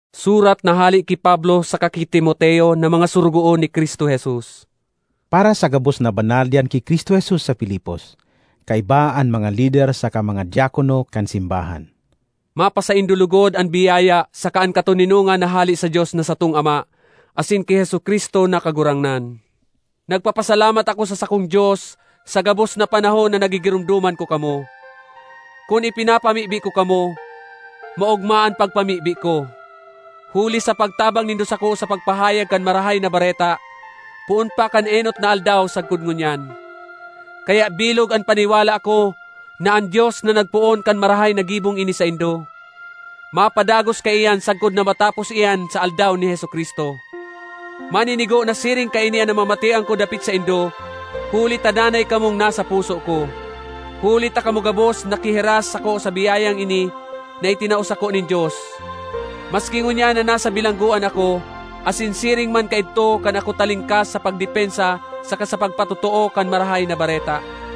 Surat na hale ki Pablo saka ki Timoteo na mga sorogoon ni Cristo Jesus. Para sa gabos na banal diyan ki Cristo Jesus sa Filipos, kaiba an mga lider saka mga diakono kan simbahan: Mapasaindo logod an biyaya saka an katoninongan na hale sa Dios na satong Ama asin ki Jesu-Cristo na Kagurangnan. Nagpapasalamat ako sa sakong Dios sa gabos na panahon na nagigiromdoman ko kamo. Kun ipinapamibi ko kamo, maogma an pagpamibi ko, huli sa pagtabang nindo sako sa pagpahayag kan Marahay na Bareta poon pa kan enot na aldaw sagkod ngunyan. Kaya bilog an paniwala ko na an Dios na nagpoon kan marahay na gibong ini saindo, mapadagos kaiyan sagkod na matapos iyan sa Aldaw ni Jesu-Cristo. Maninigo na siring kaini an namamatean ko dapit saindo huli ta danay kamong nasa puso ko. Huli ta kamo gabos nakihiras sako sa biyayang ini na itinao sako nin Dios, maski ngunyan na nasa bilanggoan ako, asin siring man kaidto kan ako talingkas sa pagdepensa saka sa pagpatotoo kan Marahay na Bareta.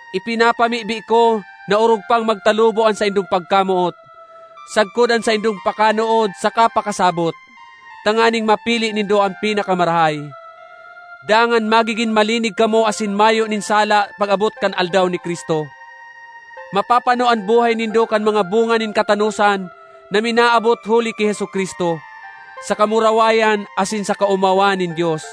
Ipinapamibi ko na orog pang magtalubo an saindong pagkamoot, sagkod an saindong pakanood saka pakasabot, tanganing mapili nindo an pinakamarahay. Dangan magigin malinig kamo asin mayo nin sala pag-abot kan Aldaw ni Cristo. Mapapano an buhay nindo kan mga bunga nin katanosan na minaabot huli ki Jesu-Cristo, sa kamurawayan asin sa kaomawan nin Dios.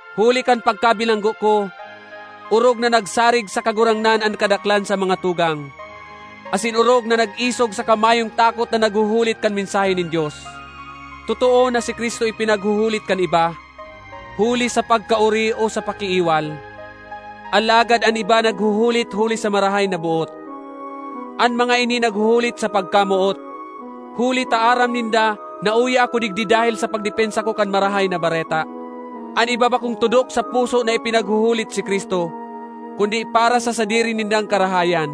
Huli kan pagkabilanggo ko, orog na nagsarig sa Kagurangnan an kadaklan sa mga tugang; asin orog na nag-isog saka mayong takot na naghuhulit kan mensahe nin Dios. Totoo na si Cristo ipinaghuhulit kan iba huli sa pagkaori o sa pakiiwal, alagad an iba naghuhulit huli sa marahay na boot. An mga ini naghuhulit sa pagkamoot, huli ta aram ninda na uya ako digdi dahel sa pagdepensa ko kan Marahay na Bareta. An iba bakong tudok sa puso na ipinaghuhulit si Cristo, kundi para sa sadiri nindang karahayan;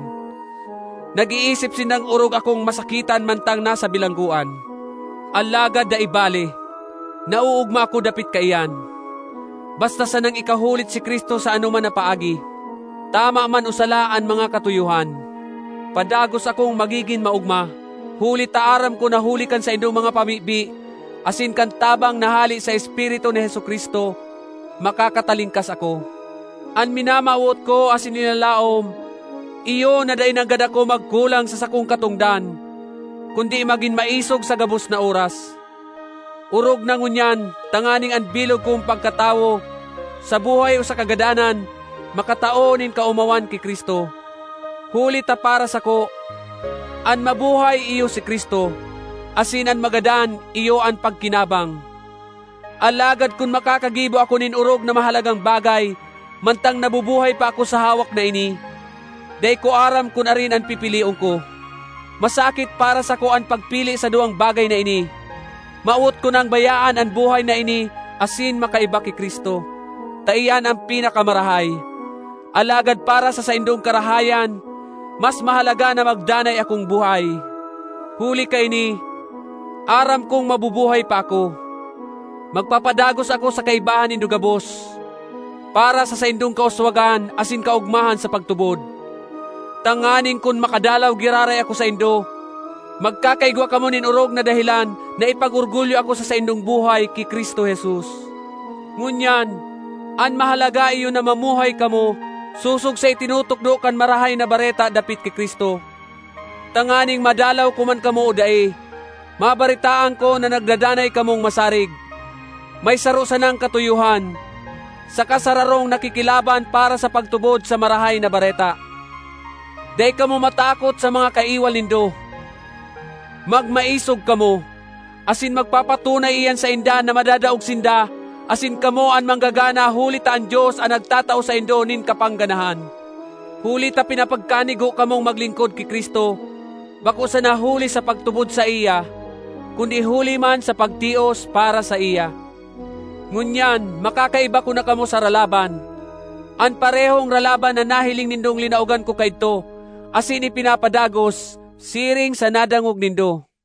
nag-iisip sindang orog akong masakitan mantang nasa bilanggoan. Alagad dai bale! Naoogma ako dapit kaiyan, basta sanang ikahulit si Cristo sa anoman na paagi, tama man o sala an mga katuyohan. Padagos akong magigin maogma, huli ta aram ko na huli kan saindong mga pamibi asin kan tabang na hale sa Espiritu ni Jesu-Cristo, makakatalingkas ako. An minamawot ko asin linalaom iyo na dai nanggad ako magkulang sa sakong katongdan kundi magin maisog sa gabos na oras, orog na ngunyan, tanganing an bilog kong pagkatawo, sa buhay o sa kagadanan, makatao nin kaomawan ki Cristo. Huli ta para sako, an mabuhay iyo si Cristo; asin an magadan iyo an pagkinabang. Alagad kun makakagibo ako nin orog na mahalagang bagay mantang nabubuhay pa ako sa hawak na ini, dai ko aram kun arin an pipilion ko. Masakit para sako an pagpili sa duwang bagay na ini. Mawot ko nang bayaan an buhay na ini asin makaiba ki Cristo, ta iyan an pinakamarahay. Alagad para sa saindong karahayan, mas mahalaga na magdanay akong buhay. Huli kaini, aram kong mabubuhay pa ako. Magpapadagos ako sa kaibahan nindo gabos, para sa saindong kauswagan asin kaogmahan sa pagtubod, tanganing kun makadalaw giraray ako saindo, magkakaigwa kamo nin orog na dahelan na ipag-orgulyo ako sa saindong buhay ki Cristo Jesus. Ngunyan, an mahalaga iyo na mamuhay kamo sosog sa itinutukdo kan Marahay na Bareta dapit ki Cristo, tanganing madalaw ko man kamo o dai, mabaretaan ko na nagdadanay kamong masarig, may saro sanang katuyohan, saka sararong nakikilaban para sa pagtubod sa Marahay na Bareta. Dai kamo matakot sa mga kaiwal nindo; magmaisog kamo, asin magpapatunay iyan sainda na madadaog sinda asin kamo an manggagana huli ta an Dios an nagtatao saindo nin kapangganahan. Huli ta pinapagkanigo kamong maglingkod ki Cristo, bako sana huli sa pagtubod saiya, kundi huli man sa pagtios para saiya. Ngunyan makakaiba ko na kamo sa ralaban—an parehong ralaban na nahiling nindong linaogan ko kaidto asin ipinapadagos, siring sa nadangog nindo.